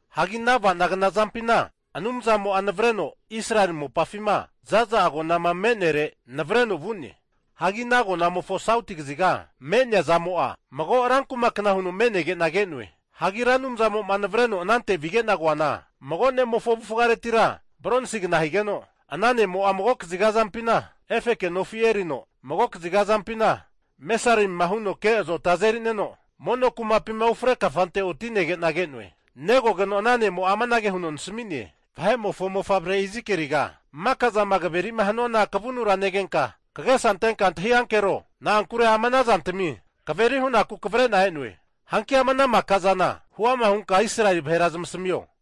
Hagi ana ava'nagna zampina Anumzamo'a navareno Israeli mopafima zaza agonama me'nere vu'ne. Hagi ana agonamofo sauti kaziga me'nea zamo'a, mago rankuma kna huno me'nege'na ke'noe. Hagi Ra Anumzamo'ma navareno anante vige'na koana, mago ne'mofo avufaretira bronsigna higeno, ana ne'mo'a mago kaziga azampina, efeke nofi erino mago kaziga azampina mesarimima huno ke azota azerineno mono no kumapima ufre kafante oti'negena ke'noe. Negogeno ana ne'mo'a amanage huno nasami'ne, vahe'mofo mofavre Izikieliga, maka zama kaveri'ma hanuana kavunura negenka kagesa antenka antahi ankero. Na'ankure ama ana zantmi kaveri hunaku kavre'na e'noe. Hanki ama ana maka zana huama hunka Israeli vahera zamasamio.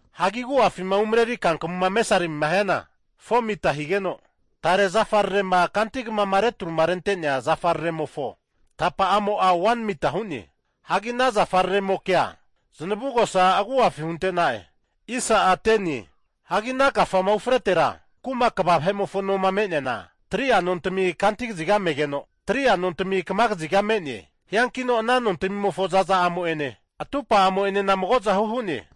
Hagi agu'afima umareri kankamuma mesarimima hiana 4mita higeno, tare zafararema kanti kamama retruma rentenea zafararemofo tapa'amo'a 1mita hu'ne. Hagi ana zafararemokea zanavugosa agu'afi hunte'na'e. Hagi ana kafama ufretera, kuma kva vahe'mofo noma me'neana 3'a nontami kanti kaziga megeno, 3'a nontami kama kaziga me'ne. Hiankino ana nontmimofo zaza'amo'ene atupa'amo'enena magozahu hu'ne.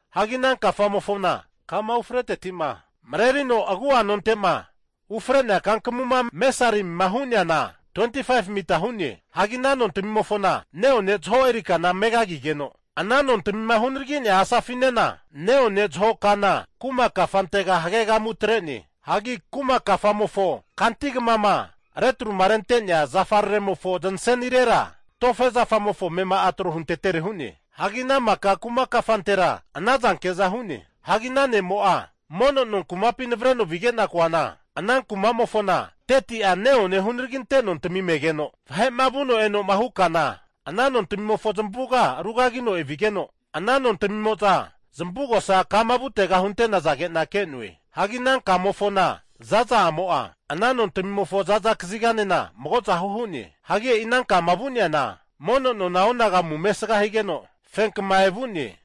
Hagi ana kafamofona kama ufreteti'ma marerino agu'a nonte'ma ufre'nea kankamuma mesarimima hu'neana, 25mita hu'ne. Hagi ana nontmimofona ne'one zaho eri kana megagigeno, ana nontamima hunaragi'nea asafinena neone zaho kana (windua) kuma kafantega hagegamu atre'ne. Hagi kuma kafamofo kanti kamama retruma rente'nea zafararemofo zanasenirera tofe zafamofo amema'a tro huntetere hu'ne. Hagi ana maka kuma kafantera anahuke'za hu'ne. Hagi ana ne'mo'a mono no kumapi navareno vige'na koana, ana kumamofona 30'a neone hunaraginte nontami megeno, vahe'ma vuno eno'ma hu kana ana nontmimofo zamavuga arugagino evigeno, ana nontamimo'za zamavugosa kama vutega hunte'nazage'na ke'noe. Hagi ana kamofona zaza'amo'a ana nontmimofo zaza kaziganena magozahu hu'ne. Hagi e'i ana kama vu'neana mono nona onagamu mesga higeno fenkma evu'ne.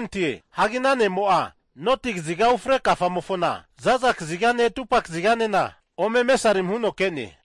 Hagi ana ne'mo'a, noti kaziga ufre kafamofona za'za kazigane atupa kaziganena ome mesarimi huno ke'ne.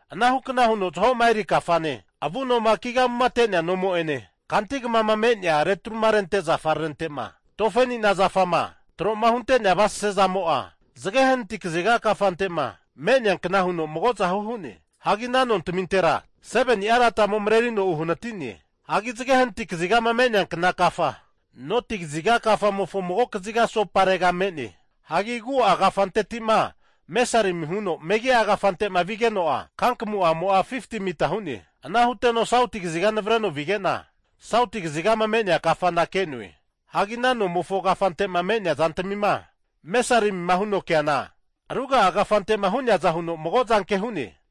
Anahukna huno zaho'ma eri kafane, avunoma kigamumate'nea nomo'ene, kanti kamama me'nea retruma rente'nea zafararente'ma tofe anina zafama trohunte'nea avasase zamo'a zage hanati kaziga kafantema me'nea kna huno magozahu hu'ne. Hagi ana nontamintera 7nia ladamo marerino uhanatine. Hagi zage hanati kazigama me'neankna kafa noti kaziga kafamofo mago kaziga asoparega me'ne. Hagi agu'a kafanteti'ma mesarimima huno megia kafante'ma vigeno'a, kankamuma'amo'a 50mita hu'ne. Ana huteno sauti kaziga nevreno vige'na, sauti kazigama me'nea kafana ke'noe. Hagi ana nomofo kafante'ma me'nea zantamima mesarimima huno ke'neana, ruga'a kafante'ma hu'neaza huno magozanke hu'ne.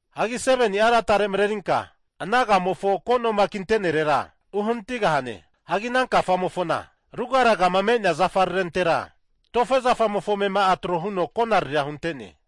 Hagi 7ni'a latare marerinka ana kafamofo ko'noma kintenerera uhanatigahane. Hagi ana kafamofona rugaragama me'nea zafararentera, tofe zafamofo amema'a trohuno konariria hunte'ne.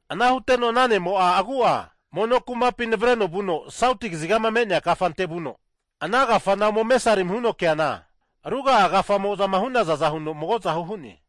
Ana huteno ana ne'mo'a agu'a mono kumapi navareno vuno sauti kazigama me'nea kafante vuno, ana kafana ome mesarimima huno keana, ruga'a kafamo'zama hu'nazaza huno magozahu hu'ne.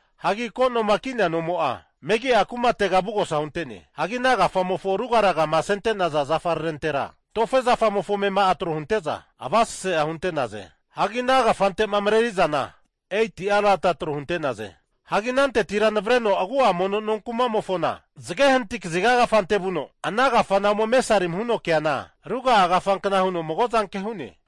Hagi ko, noma ki'nea nomo'a megi'a kumatega avugosa hunte'ne. Hagi ana kafamofo rugaragama asente'naza zafararentera tofe zafamofo amema'a trohunte'za avasasea hunte'naze. Hagi ana kafante'ma rerakaureno mareri'zana 8'a lada tro hunte'naze. Hagi anantetira navareno agu'a mono kumamofona zage hanati kaziga kafante vuno ana kafana ome mesarimima huno ke'neana, ruga'a kafankna huno magozanke hu'ne.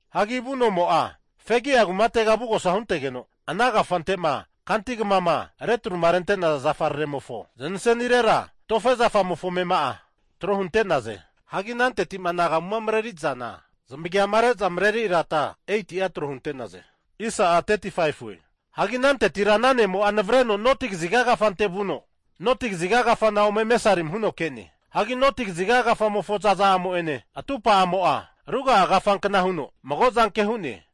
Hagi avu nomo'a, fegia kumatega avugosa huntegeno, ana kafante'ma kantikama retruma rente'naza zafararemofo zanasenirera tofe zafamofo amema'a tro hunte'naze. Hagi ananteti'ma anagamuma mareri'zana zamagiama reza mareri lada 8'a trohunte'ne. Hagi anantetira ana ne'mo'a navareno noti kaziga kafante vuno, noti kaziga kafana ome mesarimi huno ke'ne. Hagi noti kaziga kafamofo zaza'amo'ene atupa'amo'a ruga'a kafankna huno magozanke hu'ne.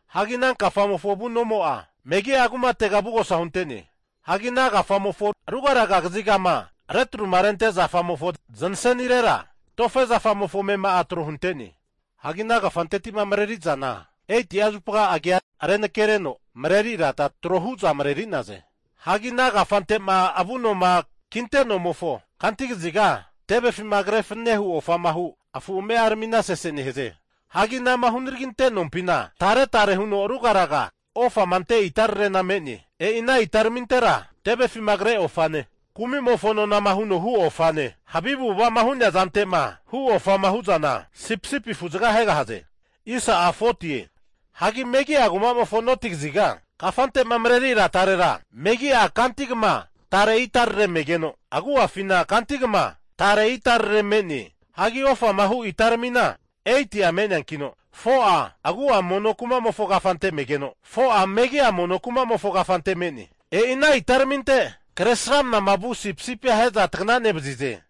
Hagi ana kafamofo avu nomo'a megi'a kumatega avugosa hunte'ne. Hagi ana kafamofo rugaraga kazigama retruma rente zafararemofo zanasenirera, tofe zafamofo amema'a trohunte'ne. Hagi ana kafante'ma mareri'zana 8'a zupa agia renake reno mareri lada trohu'za mareri'naze. Hagi ana kafante'ma avunoma kinte'nomofo kantikaziga tevefima kre fananehu ofama hu afu ame'aramina sese nehaze. Hagi anama hunaraginte nompina taretare huno rugaraga ofama ante itararena me'ne. E'i ana itararamintera tevefima kre ofane, kumimofo nonama huno hu ofane, havi avu'ava'ma hu'nea zantema hu ofama hu'zana sipisipi afuzaga ahegahaze. Hagi megi'a kumamofo noti kaziga kafante'ma mareri ladarera megi'a kanti kama tare itarare megeno, agu'afina kanti kama tare itarare me'ne. Hagi ofama hu itaramina 8'a me'neankino, 4'a agu'a mono kumamofo kafante megeno, 4'a megi'a mono kumamofo kafante me'ne. E'i ana itaraminte kresramnama vu sipisipia ahe'za tagana nevazize.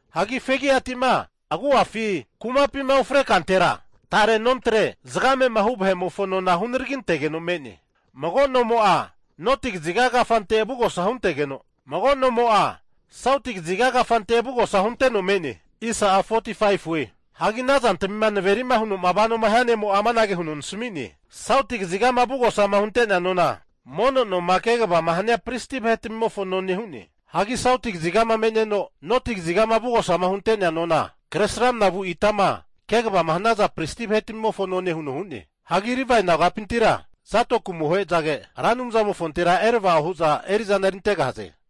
Hagi fegiatima agu'afi kumapima ufre kantera tare nontre zagamema hu vahe'mofo nona hunaragintegeno me'ne. Mago nomo'a noti kaziga kafante avugosa huntegeno, mago nomo'a sauti kaziga kafante avugosa hunteno me'ne. Hagi ana zantamima naveri'ma huno vanoma hia ne'mo'a amanage huno nasami'ne, sauti kazigama avugosama hunte'nea nona mono noma kegavama hania pristi vahe'tmimofo none hu'ne. Hagi sauti kazigama me'neno noti kazigama avugosama hunte'nea nona Kresramanama vu itama kegavama hanaza pristi vahetamimofo none huno hu'ne. Hagi Livae nagapintira Zadoki amohezage Ra Anumzamofontera erava'o hu'za eri'zana erintegahaze.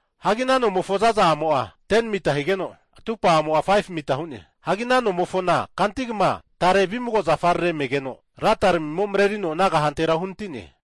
Hagi ana nomofo zaza'amo'a 10mita higeno, atupa'amo'a 5mita hu'ne. Hagi ana nomofona kantigama tare vimago zafarare megeno ladaramimo marerino ana kahantera uhanatine.